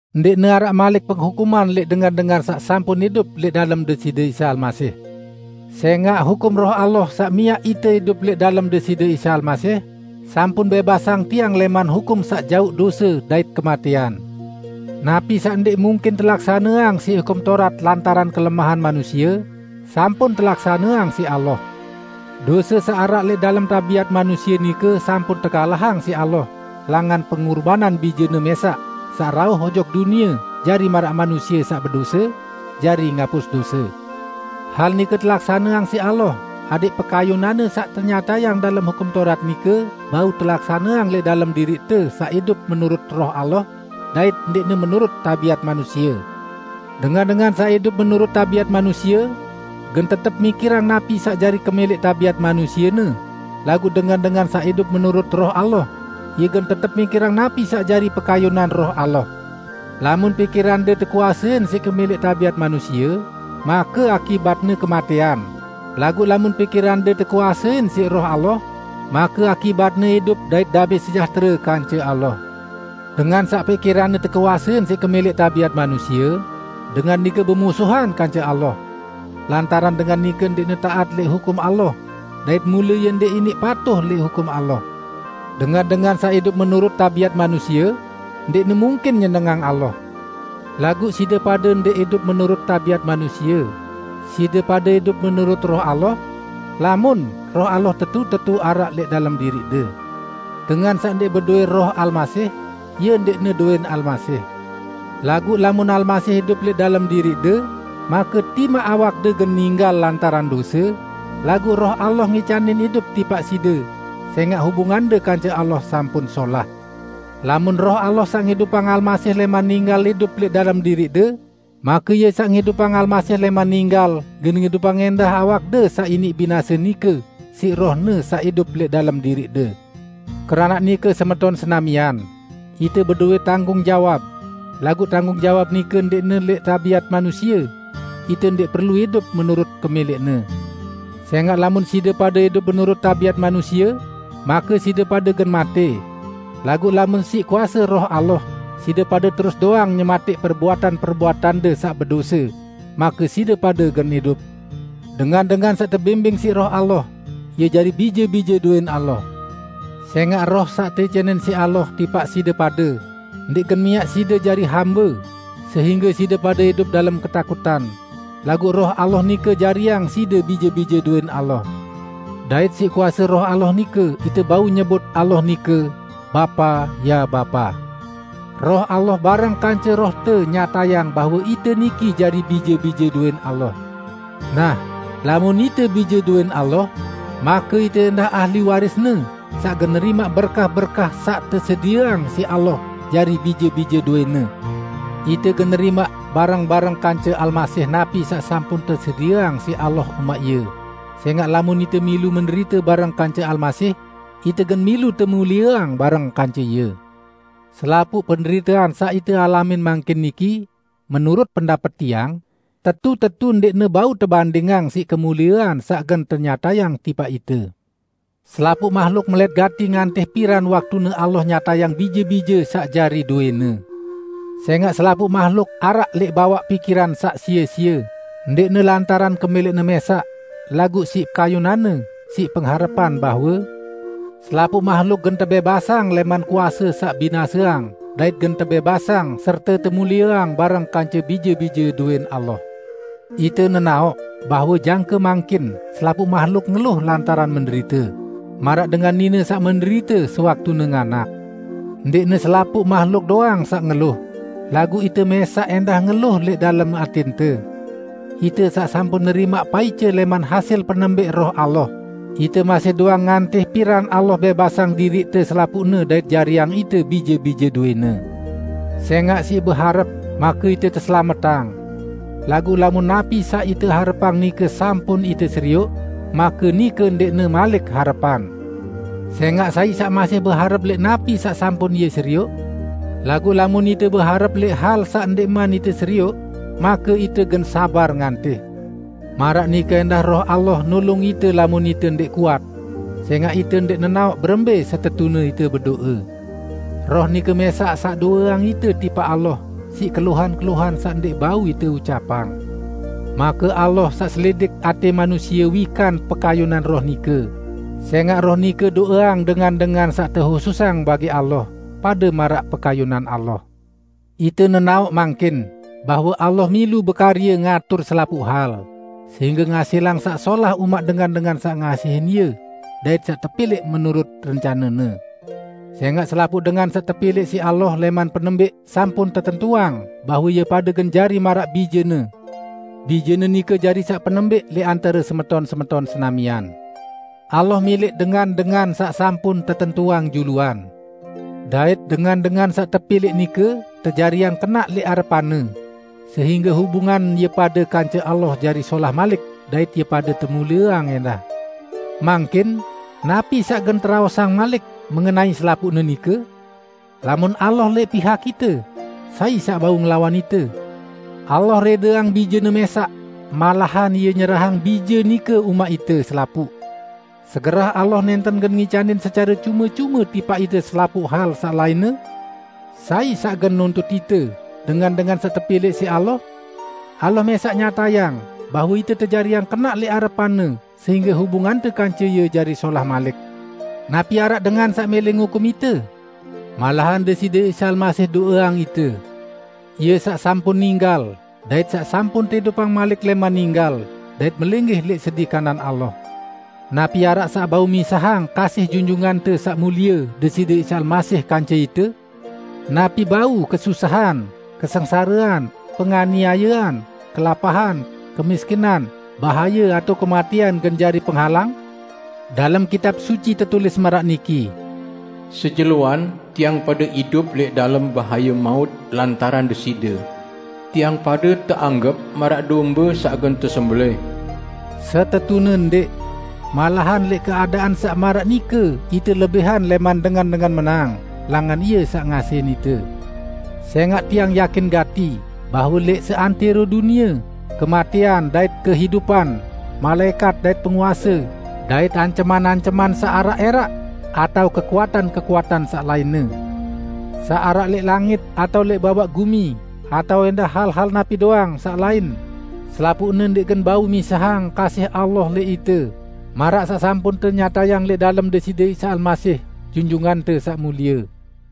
Ndẽqne araq malik penghukuman lẽq dengan-dengan saq sampun idup lẽq dalem Deside Isa Almasih. Sẽngaq hukum Roh Allah saq miaq ite idup lẽq dalem Deside Isa Almasih sampun bẽbasang tiang lẽman hukum saq jauq dose dait kematẽan. Napi saq ndẽq mungkin telaksaneang siq Hukum Taurat lantaran kelemahan manusie, sampun telaksaneang siq Allah. Dose saq araq lẽq dalem tabiat manusie nike sampun tekalahang siq Allah langan pengurbanan Bije-Ne mẽsaq saq rauh ojok dunie jari maraq manusie saq bedose, jari ngapus dose. Hal nike telaksaneang siq Allah adẽq pekayunan-Ne saq tenyatayang dalem Hukum Taurat nike bau telaksaneang lẽq dalem diriqte saq idup menurut Roh Allah, dait ndẽqne menurut tabiat manusie. Dengan-dengan saq idup menurut tabiat manusie, gen tetep mikirang napi saq jari kemẽlẽq tabiat manusiene, laguq dengan-dengan saq idup menurut Roh Allah, ie gen tetep mikirang napi saq jari pekayunan Roh Allah. Lamun pikirande tekuasein siq kemẽlẽq tabiat manusie, make akibatne kematẽan, laguq lamun pikirande tekuasein siq Roh Allah, make akibatne idup dait damẽ sejahtere kance Allah. Dengan saq pikiranne tekuasein siq kemẽlẽq tabiat manusie, dengan nike bemusuhan kance Allah; lantaran dengan nike ndẽqne taat lẽq hukum Allah; dait mule ie ndẽq iniq patuh lẽq hukum Allah. Dengan-dengan saq idup menurut tabiat manusie, ndẽqne mungkin nyenengang Allah. Laguq side pade ndẽq idup menurut tabiat manusie, side pade idup menurut Roh Allah -- lamun, Roh Allah tetu-tetu araq lẽq dalem diriqde. Dengan saq ndẽq bedowẽ Roh Almasih, ie ndẽqne dowẽn Almasih. Laguq lamun Almasih idup lẽq dalem diriqde, make timaq awakde gen ninggal lantaran dose, laguq Roh Allah ngicanin idup tipaq side, sẽngaq hubungande kance Allah sampun solah. Lamun Roh Allah saq ngidupang Almasih lẽman ninggal idup lẽq dalem diriqde, make Ie saq ngidupang Almasih lẽman ninggal gen ngidupang ẽndah awakde saq iniq binase nike siq Roh-Ne saq idup lẽq dalem diriqde. Keranaq nike semeton senamian, ite bedowẽ tanggung jawab, laguq tanggung jawab nike ndẽqne lẽq tabiat manusie; ite ndẽq perlu idup menurut kemẽlẽqne. Sẽngaq lamun side pade idup menurut tabiat manusie, make side pade gen matẽ; laguq lamun siq kuase Roh Allah side pade terus doang nyematẽq perbuatan-perbuatande saq bedose, make side pade gen idup. Dengan-dengan saq tebimbing siq Roh Allah, ie jari bije-bije dowẽn Allah. Sẽngaq Roh saq teicanin siq Allah tipaq side pade, ndẽq gen miaq side jari hambe sehingge side pade idup dalem ketakutan, laguq Roh Allah nike jariang side bije-bije dowẽn Allah. Dait siq kuase Roh Allah nike ite bau nyebut Allah nike, "Bapa, ya Bapa!" Roh Allah bareng kance rohte nyatayang bahwe ite niki jari bije-bije dowẽn Allah. Nah, lamun ite bije dowẽn Allah, make ite ẽndah ahli waris-Ne saq gen nerimaq berkah-berkah saq tesedieang siq Allah jari bije-bije dowẽ-Ne. Ite gen nerimaq bareng-bareng kance Almasih napi saq sampun tesedieang siq Allah umaq Ie; sẽngaq lamun ite milu menderite bareng kance Almasih, ite gen milu temulieang bareng kance Ie. Selapuq penderitean saq ite alamin mangkin niki, menurut pendapet tiang, tetu-tetu ndẽqne bau tebandingang siq kemuliean saq gen tenyatayang tipaq ite. Selapuq mahluk melẽt gati ngantih piran waktune Allah nyatayang bije-bije saq jari dowẽ-Ne. Sẽngaq selapuq mahluk araq lẽq bawaq pikiran saq sie-sie, ndẽqne lantaran kemẽlẽqne mẽsaq, laguq siq pekayunan-Ne, siq pengharepan bahwe: Selapuq mahluk gen tebẽbasang lẽman kuase saq binaseang dait gen tebẽbasang serte temulieang bareng kance bije-bije dowẽn Allah. Ite nenaoq bahwe jangke mangkin selapuq mahluk ngeluh lantaran menderite, maraq dengan nine saq menderite sewaktune nganak. Ndẽqne selapuq mahluk doang saq ngeluh, laguq ite mẽsaq ẽndah ngeluh lẽq dalem atẽnte. Ite saq sampun nerimaq paice lẽman hasil penembẽq Roh Allah, ite masih doang ngantih piran Allah bẽbasang diriqte selapuqne dait jariang ite bije-bije dowẽ-Ne. Sẽngaq siq beharep, make ite teselametang. Laguq lamun napi saq ite harepang nike sampun ite serioq, make nike ndẽqne malik harepan. Sẽngaq sai saq masih beharep lẽq napi saq sampun ie serioq? Laguq lamun ite beharep lẽq hal saq ndẽqman ite serioq, make ite gen sabar ngantih. Maraq nike ẽndah Roh Allah nulung ite lamun ite ndẽq kuat. Sẽngaq ite ndẽq nenaoq berembẽ setetune ite bedo'e; Roh nike mẽsaq saq do'eang ite tipaq Allah siq keluhan-keluhan saq ndẽq bau ite ucapang. Make Allah saq selidik atẽ manusie, wikan pekayunan Roh nike, sẽngaq Roh nike do'eang dengan-dengan saq tehususang bagi Allah, pade maraq pekayunan Allah. Ite nenaoq mangkin bahwe Allah milu bekarye ngatur selapuq hal, sehingge ngasilang saq solah umaq dengan-dengan saq ngasihin Ie dait saq tepilẽq menurut rencane-Ne. Sẽngaq selapuq dengan saq tepilẽq siq Allah lẽman penembẽq sampun tetentuang bahwe ie pade gen jari maraq Bije-Ne. Bije-Ne nike jari saq penembẽq lẽq antare semeton-semeton senamian. Allah milẽq dengan-dengan saq sampun tetentuang juluan; dait dengan-dengan saq tepilẽq nike tejariang kenaq lẽq arepan-Ne sehingge hubungan ie pade kance Allah jari solah malik dait ie pade temulieang ẽndah. Mangkin, napi saq gen teraosang malik mengenai selapuqne nike? Lamun Allah lẽq pihak ite, sai saq bau ngelawan ite? Allah rẽdeang Bije-Ne mẽsaq, malahan Ie nyerahang Bije nike umaq ite selapuq. Segerah Allah nẽnten gen ngicanin secare cume-cume tipaq ite selapuq hal saq lainne? Sai saq gen nuntut ite, dengan-dengan saq tepilẽq siq Allah? Allah mẽsaq nyatayang bahwe ite tejariang kenaq lẽq arepan-Ne sehingge hubungante kance Ie jari solah malik. Napi araq dengan saq mẽlẽ ngukum ite? Malahan Deside Isa Almasih do'eang ite! Ie saq sampun ninggal dait saq sampun teidupang malik lẽman ninggal dait melinggih lẽq sedi kanan Allah. Napi araq saq bau misahang kasih Junjungante Saq Mulie Deside Isa Almasih kance ite? Napi bau kesusahan, kesengsarean, penganiayean, kelapahan, kemiskinan, bahaye atao kematẽan gen jari penghalang? Dalem Kitab Suci tetulis maraq niki, "Sejeloan tiang pade idup lẽq dalem bahaye maut lantaran Deside. Tiang pade teanggep maraq dombe saq gen tesembelẽh." Setetune ndẽq! Malahan lẽq keadaan saq maraq nike ite lebihan lẽman dengan-dengan menang, langan Ie saq ngasihin ite! Sẽngaq tiang yakin gati bahwe lẽq seantẽro dunie, kematẽan dait kehidupan, malaẽkat dait penguase dait anceman-anceman saq araq ẽraq; atao kekuatan-kekuatan saq lainne; saq araq lẽq langit atao lẽq bawaq gumi atao ẽndah hal-hal napi doang saq lain, selapuqne ndẽq gen bau misahang kasih Allah lẽq ite, maraq saq sampun tenyatayang lẽq dalem Deside Isa Almasih, Junjungante Saq Mulie.